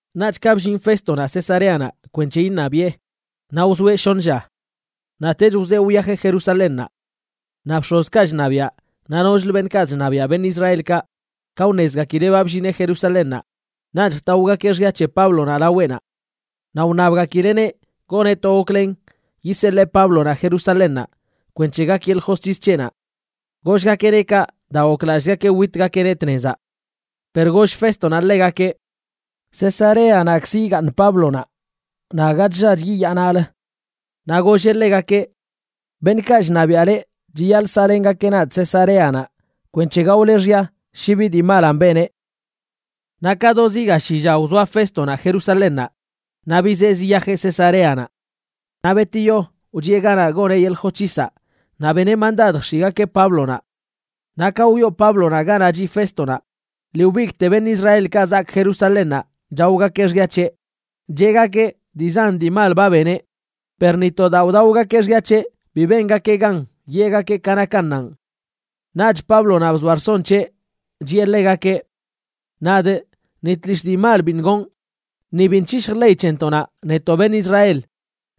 Naꞌch ka bllin Féstonaꞌ Cesareanaꞌ kwenc̱he iṉabiꞌe, naꞌ wzoeꞌ shoṉ lla. Naꞌtech wzee wyajeꞌ Jerusalénnaꞌ. Naꞌ bx̱ozkaꞌ chṉabiaꞌ naꞌ nochlə beṉꞌkaꞌ chṉabiaꞌ beṉꞌ Israelkaꞌ ka wṉezgakileꞌ ba bllineꞌ Jerusalénnaꞌ, naꞌch jtaogakeꞌ xya c̱he Páblonaꞌ laweꞌnaꞌ. Naꞌ wṉabgakileꞌneꞌ goneꞌ to goklen yiseḻee Páblonaꞌ Jerusalénnaꞌ kwenc̱he gak yeḻꞌ josc̱his c̱heꞌnaꞌ. Gollgakeꞌneꞌ kaꞌ daa goklallꞌgakeꞌ witgakeꞌneꞌ tnezaꞌ. Per goll Féstonaꞌ ḻegakeꞌ: ―Cesareanaꞌzkzə yigaaṉ Páblonaꞌ, naꞌ aga chllach yiyaa naꞌlə. Naꞌ golleꞌ ḻegakeꞌ: ―Beṉꞌkaꞌ chṉabiaꞌ leꞌ chiyaḻꞌ saꞌlengakeꞌ nadꞌ Cesareanaꞌ kwenc̱he gaole xya shi bi dii malan beneꞌ. Naꞌ ka do zi ga shi lla wzoa Féstonaꞌ Jerusalénnaꞌ, naꞌ bizee ziyajeꞌ Cesareanaꞌ. Naꞌ betiyo wchiꞌe ganaꞌ goneꞌ yeḻꞌ josc̱hisaꞌ naꞌ beneꞌ mandad jx̱iꞌgakeꞌ Páblonaꞌ. Naꞌ ka wyoo Páblonaꞌ ganaꞌ chiꞌ Féstonaꞌ lii wbigꞌte beṉꞌ Israelkaꞌ zaak Jerusalénnaꞌ chaogakeꞌ xya c̱heꞌ, cheꞌgakeꞌ dii zan dii mal ba beneꞌ, per naꞌ ni to daa wdaogakeꞌ xya c̱heꞌ bi bengakeꞌ gan yeꞌgakeꞌ ka nakannanꞌ. Naꞌch Páblonaꞌ bzoa rson c̱heꞌ, chiꞌe ḻegakeꞌ: ―Nadꞌ ni tlishꞌ dii mal biṉꞌ gonꞌ, ni biṉꞌ c̱hishjꞌ ley c̱hentoꞌnaꞌ netoꞌ beṉꞌ Israel,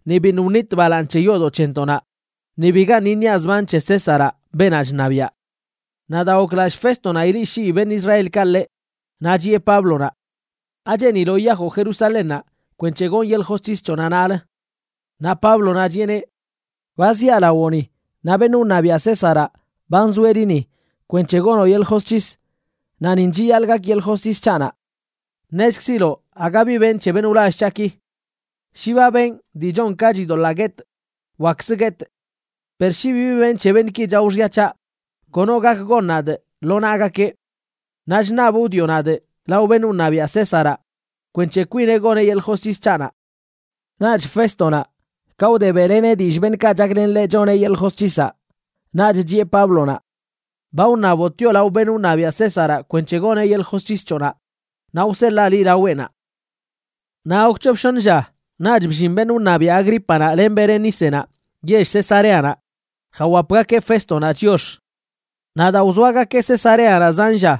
ni biṉꞌ wnitꞌ balaaṉ c̱he yoodoꞌ c̱hentoꞌnaꞌ, ni bigaṉꞌ iṉiaꞌ zban c̱he Césaraꞌ beenaꞌ chṉabiaꞌ. Naꞌ daa goklallꞌ Féstonaꞌ ileꞌshii beṉꞌ Israelkaꞌ ḻeꞌ, naꞌ chiꞌe Páblonaꞌ: ―¿Acheeniloꞌ yiyajoꞌ Jerusalénnaꞌ kwenc̱he gonꞌ yeḻꞌ josc̱his c̱hoꞌnaꞌ naꞌlə? Naꞌ Páblonaꞌ chiꞌeneꞌ: ―Ba ziaꞌ lawoꞌni, naꞌ beṉꞌ wṉabiaꞌ Césaraꞌ ba nzoeꞌ liꞌ ni kwenc̱he gonoꞌ yeḻꞌ josc̱his, naꞌ nin chiyaḻꞌ gak yeḻꞌ josc̱his c̱haꞌnaꞌ. Ṉezkziloꞌ aga bi benꞌ c̱he beṉꞌ wlall c̱haꞌki. Shi ba benꞌ dii chon ka chidoḻaa guetꞌ, wakkzə guetꞌ. Per shi bibi benꞌ c̱he beṉꞌki chao xya c̱haꞌ, kono gak gon nadꞌ lo naꞌgakeꞌ. Naꞌ chṉabꞌ wdioꞌ nadꞌ lao beṉꞌ wṉabiaꞌ Césaraꞌ kwenc̱he kwineꞌ goneꞌ yeḻꞌ josc̱his c̱haꞌnaꞌ. Naꞌch Féstonaꞌ, ka wde beꞌleneꞌ dillꞌ beṉꞌkaꞌ chaklen ḻeꞌ choneꞌ yeḻꞌ josc̱hisaꞌ, naꞌch chiꞌe Páblonaꞌ: ―Ba wṉaboꞌ tioꞌ lao beṉꞌ wṉabiaꞌ Césaraꞌ kwenc̱he goneꞌ yeḻꞌ josc̱his c̱hoꞌnaꞌ, naꞌ wseḻaa liꞌ laweꞌnaꞌ. Naꞌ gok c̱hop shoṉ lla naꞌch bllin beṉꞌ wṉabiaꞌ Agrípanaꞌ len Berenícenaꞌ yell Cesareanaꞌ jawapgakeꞌ Féstonaꞌ chiox. Naꞌ daa wzoagakeꞌ Cesareanaꞌ zan lla,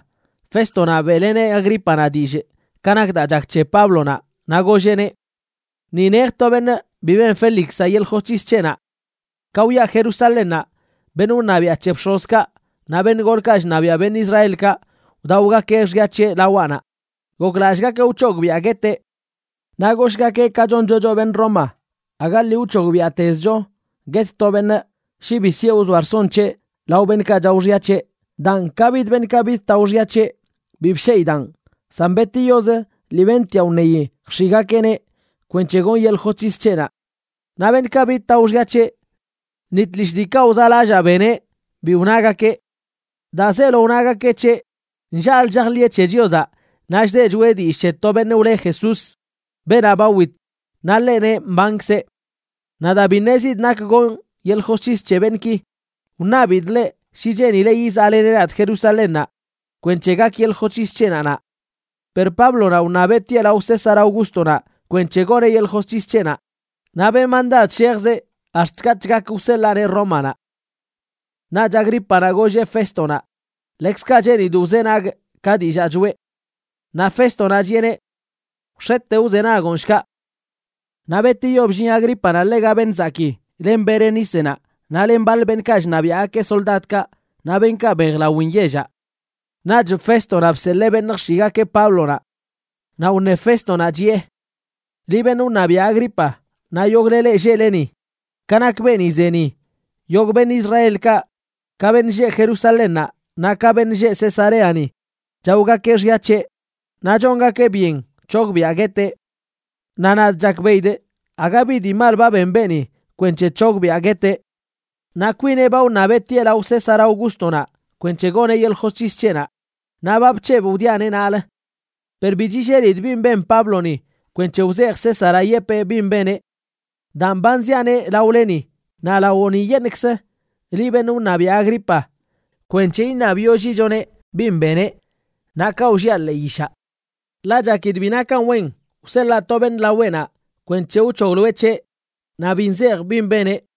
Féstonaꞌ beꞌleneꞌ Agrípanaꞌ dillꞌ ka nak daa chak c̱he Páblonaꞌ, naꞌ golleꞌneꞌ: ―Ni nej to beṉꞌ bi ben Félixaꞌ yeḻꞌ josc̱his c̱heꞌnaꞌ. Ka wyaꞌ Jerusalénnaꞌ, beṉꞌ wṉabiaꞌ c̱he bx̱ozkaꞌ naꞌ beṉꞌ golkaꞌ chṉabiaꞌ beṉꞌ Israelkaꞌ wdaogakeꞌ xya c̱heꞌ lawaꞌnaꞌ, goklallꞌgakeꞌ wc̱hogbiꞌa gueteꞌ. Naꞌ goshꞌgakee ka choncho choꞌ beṉꞌ Roma, aga lii wc̱hogbiaꞌtezcho guet to beṉꞌ shi bi sieꞌ wzoa rson c̱heꞌ lao beṉꞌkaꞌ chao xya c̱heꞌ. Daan, ka bid beṉꞌkaꞌ bidtao xya c̱heꞌ, bi bsheꞌidaꞌn, san betiyoz lii bentiaꞌ wṉeyi jx̱iꞌgakeꞌneꞌ kwenc̱he gonꞌ yeḻꞌ josc̱his c̱heꞌnaꞌ. Naꞌ beṉꞌkaꞌ bidtao xya c̱heꞌ, ni tlishꞌ diikaꞌ wzaꞌlallaa beneꞌ bi wnagakeꞌ. Daa zeelo nagakeꞌ c̱heꞌ, nllaꞌlə chajḻiꞌe c̱he Chiozaꞌ naꞌ chdeꞌ choꞌe dillꞌ c̱he to beṉꞌ wle Jesús, beenaꞌ ba wit, naꞌ ḻeꞌ neꞌ mbankzeꞌ. Naꞌ daa bi ṉezidꞌ nak gonꞌ yeḻꞌ josc̱his c̱he beṉꞌki, wṉabidꞌ ḻeꞌ shi cheenileꞌ yizaꞌleneꞌ nadꞌ Jerusalénnaꞌ kwenc̱he gak yeḻꞌ josc̱his c̱heꞌnaꞌ naꞌ. Per Páblonaꞌ wṉabeꞌ tieꞌ lao César Augústonaꞌ kwenc̱he goneꞌ yeḻꞌ josc̱his c̱heꞌnaꞌ, naꞌ benꞌ mandad shejzeꞌ ax̱t katꞌch gak wseḻaaneꞌ Rómanaꞌ. Naꞌch Agrípanaꞌ golleꞌ Féstonaꞌ: ―Ḻekzkaꞌ cheenidꞌ wzenagꞌ ka dillaa choꞌe. Naꞌ Féstonaꞌ chiꞌeneꞌ: ―Wx̱ete wzenagoꞌn, shkaꞌ. Naꞌ betiyo bllin Agrípanaꞌ ḻega beṉꞌ zakii, len Berenícenaꞌ naꞌ len baḻ beṉꞌkaꞌ chṉabiaꞌgakeꞌ soldadkaꞌ, naꞌ beṉꞌkaꞌ mbejlawin yellaꞌ. Naꞌch Féstonaꞌ bseḻee beṉꞌ jx̱iꞌgakeꞌ Páblonaꞌ. Naꞌ wṉe Féstonaꞌ, chiꞌe: ―Liꞌ beṉꞌ wṉabiaꞌ Agripa, naꞌ yogꞌle leꞌ lleꞌle ni, ka nak beeni ze ni, yogꞌ beṉꞌ Israelkaꞌ, ka beṉꞌ lleꞌ Jerusalénnaꞌ naꞌ ka beṉꞌ lleꞌ Cesareani, chaogakeꞌ xya c̱heꞌ, naꞌ chongakeꞌ byen c̱hogbiꞌa gueteꞌ. Naꞌ nadꞌ chakbeꞌidꞌ aga bi dii mal ba ben beeni kwenc̱he c̱hogbiꞌa gueteꞌ. Naꞌ kwineꞌ ba wṉabeꞌ tieꞌ lao César Augústonaꞌ kwenc̱he goneꞌ yeḻꞌ josc̱his c̱heꞌnaꞌ, naꞌ ba bc̱hebꞌ wdiaꞌneꞌ naꞌlə. Per bi chillelidꞌ bin ben Pábloni kwenc̱he wzejꞌ Césaraꞌ yepee bin beneꞌ. Daan ba nziaꞌneꞌ laoleni naꞌ lawoꞌniyeṉꞌkzə liꞌ, beṉꞌ wṉabiaꞌ Agripa, kwenc̱he iṉabyollichoneꞌ bin beneꞌ, naꞌ kaꞌ wlliaꞌ ḻee yishaꞌ. Ḻaꞌ chakidꞌ bi nakan wen wseḻaa to beṉꞌ laweꞌnaꞌ kwenc̱he wc̱hogloeꞌ c̱heꞌ naꞌ bi nzejꞌ bin beneꞌ.